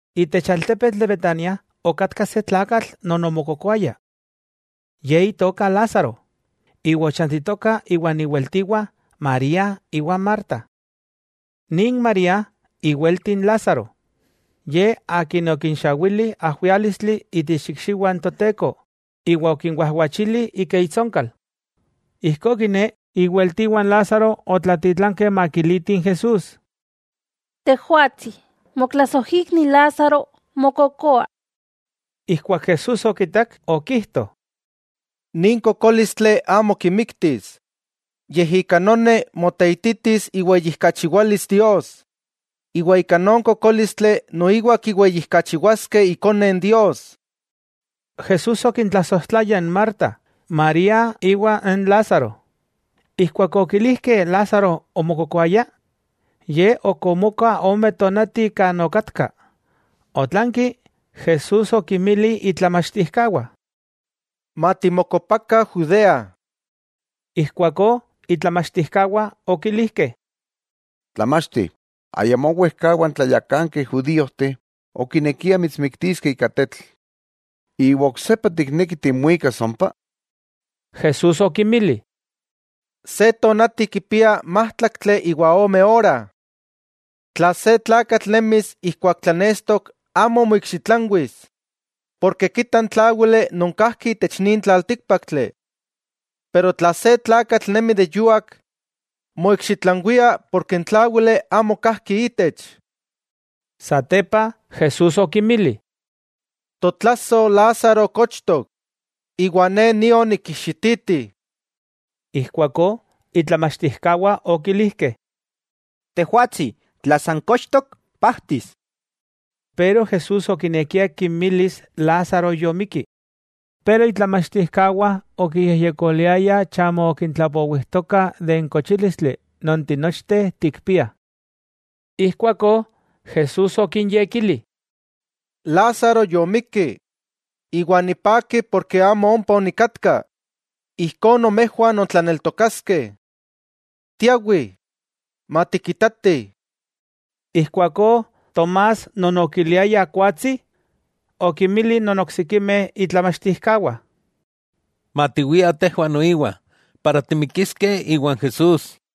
Itech altepetl de Betania okatka se tlakatl non omokokoaya. Ye itoka Lázaro, iwa ochantitoka iwan iweltiwah María iwa Marta. Nin María iwelti n Lázaro, ye akin okinxawili ajwiálistli itech ikxiwah n Toteko iwa okinwajwachili ika itsonkal. Ijkó kiné, iweltiwah n Lázaro otlatitlankeh makilitih n Jesús: —Tejwatsi, motlasojikni Lázaro mokokoa. Ijkuak Jesús okikak, okijto: —Nin kokólistli amo kimiktis, yej ika noni moteititis iweyijkachiwalis Dios, iwa ika non kokólistli noiwa kiweyijkachiwaskeh Ikone Dios. Jesús okintlasojtlaya n Marta, María iwa n Lázaro. Ijkuak okilijkeh Lázaro omokokoaya, Ye ok omoka ome tonati kan okatka. Otlanki Jesús okinmili itlamachtijkawah: —Matimokopakah Judea. Ijkuakó itlamachtijkawah okilijkeh: —Tlamachti, ayamó wejkawa n tlayakankeh judíojteh okinekiah mitsmiktiskeh ika tetl; ¿iwa oksepa tikneki timuikas ompa? Jesús okinmili: —Se tonati kipia májtlaktli iwa ome ora. Tla se tlakatl nemis ijkuak tlanestok amo moikxitlanwis, porke kita n tláwili non kajki itech nin tlaltíkpaktli, pero tla se tlakatl nemi de yuak, moikxitlanwia porke n tláwili amo kajki itech. Satepa Jesús okinmili: —Totlasoj Lázaro kochtok, iwa Ne nio nikijxititi. Ijkuakó itlamachtijkawah okilijkeh: —Tejwatsi, tla san kochtok, pajtis. Pero Jesús okinekia kimilis Lázaro yomikki, pero itlamachtijkawah okiyejyekoliayah chamo okintlapowijtoka de n kochílistli non tinochteh tikpiah. Ijkuakó Jesús okinyekili: —Lázaro yomikki. Iwa nipaki porke amo ompa onikatka, ijkó nomejwah nontlaneltokaskeh. Tiawih, matikitatih. Ijkuakó Tomás non okiliayah Kuatsi, okinmili non oksikimeh itlamachtijkawah: —Matiwiah tejwah noiwa, para timikiskeh iwan Jesús.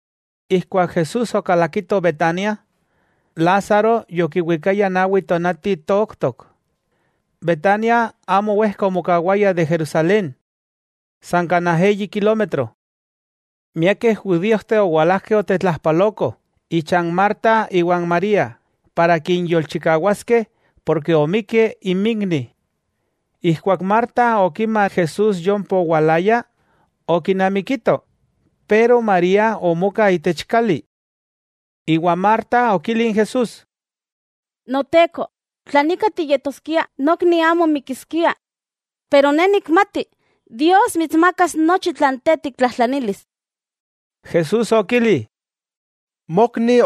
Ijkuak Jesús okalakito Betania, Lázaro yokiwikaya nawi tonati tooktok. Betania amo wejka omokawaya de Jerusalén, san kanaj eyi kilómetro. Miakeh judíojteh owalajkeh otetlajpaloko ichan Marta iwa n María para kinyolchikawaskeh porke omikki inmikni. Ijkuak Marta okima Jesús yompa owalaya, okinamikito, pero María omoka itech kali. Iwa Marta okili n Jesús: —Noteko, tla nika tiyetoskia, nokni amo mikiskia. Pero ne nikmati Dios mitsmakas nochi tlan Te tiktlajtlanilis. Jesús okili: —Mokni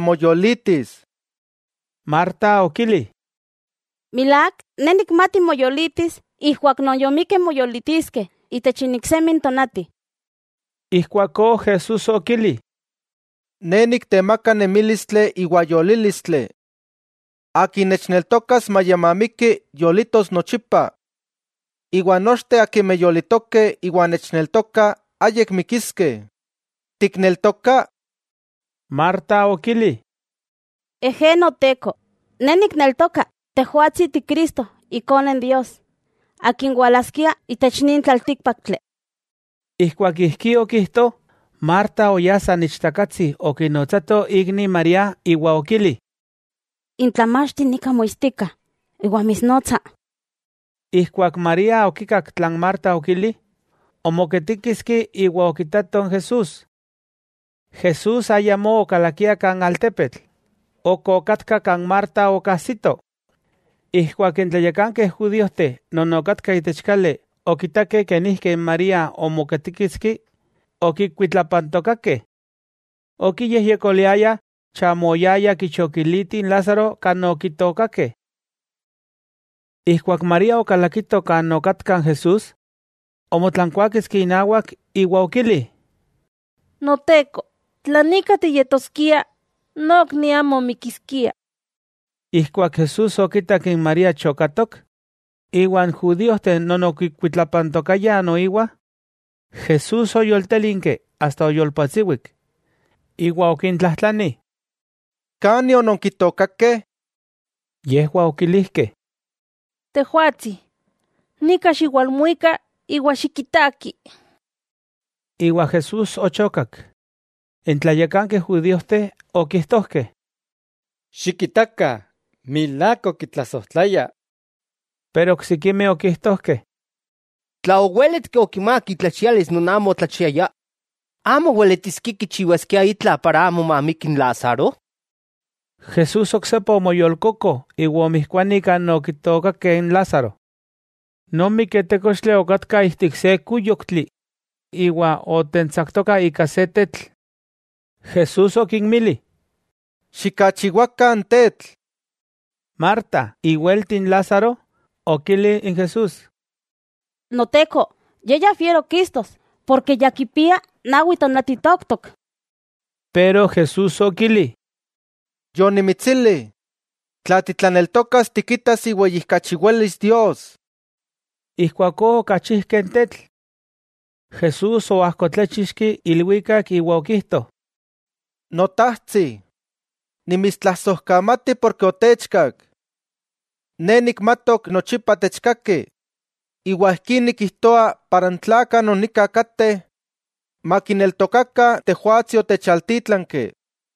moyolitis. Marta okili: —Milák, ne nikmati moyolitis ijkuak non yomikeh moyolitiskeh itech n iksemi tonati. Ijkuakó Jesús okili: —Ne niktemaka nemílistli iwa yolílistli. Akin nechneltokas maya mamiki, yolitos nochipa. Iwa nochteh akimeh yolitokeh iwa nechneltokah ayik mikiskeh. ¿Tikneltoka? Marta okili: —Ejé, Noteko, ne nikneltoka Tejwatsi Ti Cristo Ikone Dios, Akin walaskia itech nin tlaltíkpaktli. Ijkuak ijkí okijto, Marta oyá san ichtakatsi okinotsato ikni María iwa okili: —N Tlamachti nika moitstika iwa mitsnotsa. Ijkuak María okikak tlan Marta okili, omoketíkiski iwa okitato n Jesús. Jesús ayamó okalakia kan altepetl, ok okatka kan Marta okajsito. Ijkuak n tlayakankeh judíojteh non okatkah itech kali okitakeh kenijki n María omoketíkiski, okikuitlapantokakeh. Okiyejyekoliayah chamo oyaya kichokiliti n Lázaro kan okitookakeh. Ijkuak María okalakito kan okatka n Jesús, omotlankuáketski inawak iwa okili: —Noteko, tla nika tiyetoskia, nokni amo mikiskia. Ijkuak Jesús okitak n María chokatok, iwa n judíojteh non okikuitlapantokayah noiwa, Jesús oyoltélinki asta oyolpatsiwik. Iwa okintlajtlani: —¿Kani ononkitookakeh? Yejwah okilijkeh: —Tejwatsi, nika xiwalmuika iwa xikitaki. Iwa Jesús ochokak. N tlayakankeh judíojteh okijtojkeh: —¡Xikitakah, milák okitlasojtlaya! Pero oksikimeh okijtojkeh: —Tla owéletki okimák itlachialis non amo otlachiaya, ¿amo weletiskia kichiwaskia itla para amo mamiki n Lázaro? Jesús oksepa omoyolkoko iwa omijkuani kan okitookakeh n Lázaro. Non miketékochtli okatka ijtik se kúyoktli iwa otentsaktoka ika se tetl. Jesús okinmili: —Xikachiwakah n tetl. Marta, iwelti n Lázaro, okili n Jesús: —Noteko, ye ya fiero kistos porke ya kipia nawi tonati tooktok. Pero Jesús okili: —Yonimitsili, tla titlaneltokas tikitas iweyijkachiwalis Dios. Ijkuakó okachijkeh n tetl. Jesús oajkotláchixki ilwikak iwa okijto: —Notajtsi, nimitstlasojkamati porke otechkak. Ne nikmatok nochipa techkaki, iwa ijkí nikijtoa para n tlakah non nika kateh makineltokakah Tejwatsi otechaltítlanki.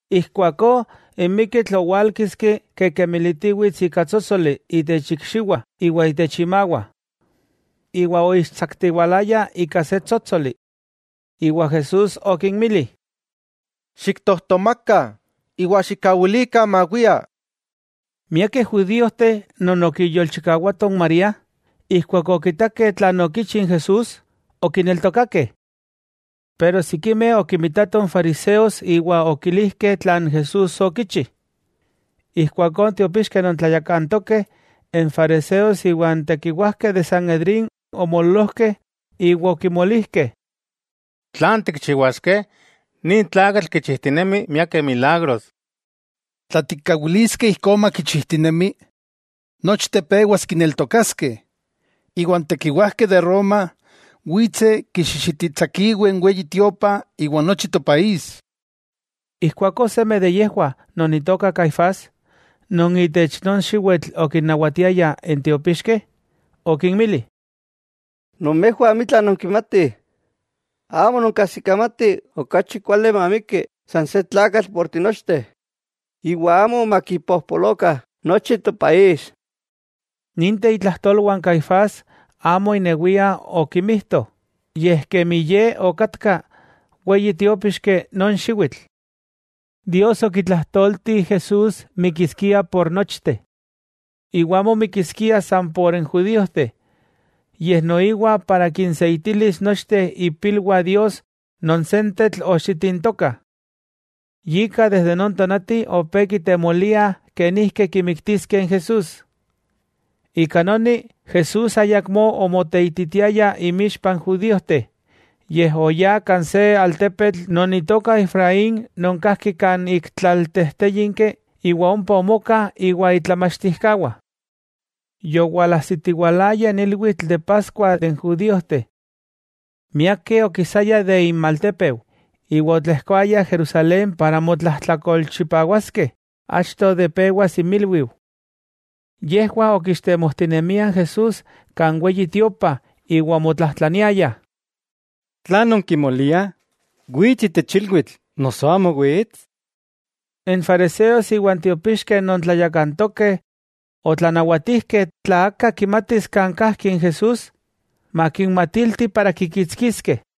Ijkuakó n miketl owálkiski kikekemelitiwits ika tsótsoli itech ikxiwah iwa itech imawah, iwa oixtsaktiwalaya ika se tsótsoli. Iwa Jesús okinmili: —Xiktojtomakah iwa xikkawilikah mawia. Miakeh judíojteh non okiyolchikawatoh n María, ijkuak okitakeh tlan okichi n Jesús, okineltokakeh. Pero sikimeh okimitatoh n fariseos iwa okimilijkeh tlan Jesús okichi. Ijkuakó n tiopixkeh non tlayakantokeh, n fariseos iwa n tekiwajkeh de Sanedrín omoololojkeh iwa okimolijkeh: —¿Tlan tikchiwaskeh? Nin tlakatl kinchijtinemi miakeh milagros. Tla tikkawiliskeh ijkó makichijtinemi, nochteh pewas kineltokaskeh, iwa n tekiwajkeh de Roma witseh kixixititsakiweh n Weyi Tiopa iwa n nochi topaís. Ijkuakó seme de yejwah non itoka Caifás, non itech non xiwitl okinnawatiaya n tiopixkeh, okinmili: —Nomejwah amitla nonkimatih, amo nonkajsikamatih okachi kuali mamiki san se tlakatl por tinochteh, iwa amo makipojpolokah nochi topaís. Ninteh itlajtolwah n Caifás amo inewia okimijto, yej kemi ye okatka weyi tiópixki non xiwitl, Dios okitlajtolti Jesús mikiskia por nochteh. Iwa amo mikiskia san por n judíojteh, yej noiwa para kinseitilis nochteh ipilwah Dios non sentetl oxitintokah. Yika desde non tonati opé kitemoliah kenijki kimiktiskeh n Jesús. Ika noni, Jesús ayakmó omoteititiaya inmixpah n judíojteh, yej oyá kan se altepetl non itoka Efraín non kajki kan ik tlaltejtéyinki, iwa ompa omoka iwa itlamachtijkawah. Yowalajsitiwalaya n ilwitl de Paskua de n judíojteh. Miakeh okisayah de inmaltépeu iwa otlejkoayah Jerusalén para motlajtlakolchipawaskeh achto de pewas inmilwiu. Yejwah okixtemojtinemiah n Jesús kan Weyi Tiopa iwa omotlajtlaniayah: —¿Tlan non kimoliah? ¿Wits itech ilwitl noso, amo wits? N fariseos iwa n tiopixkeh non tlayakantokeh otlanawatijkeh tla aka kimatis kan kajki n Jesús, makinmatilti para kikitskiskeh.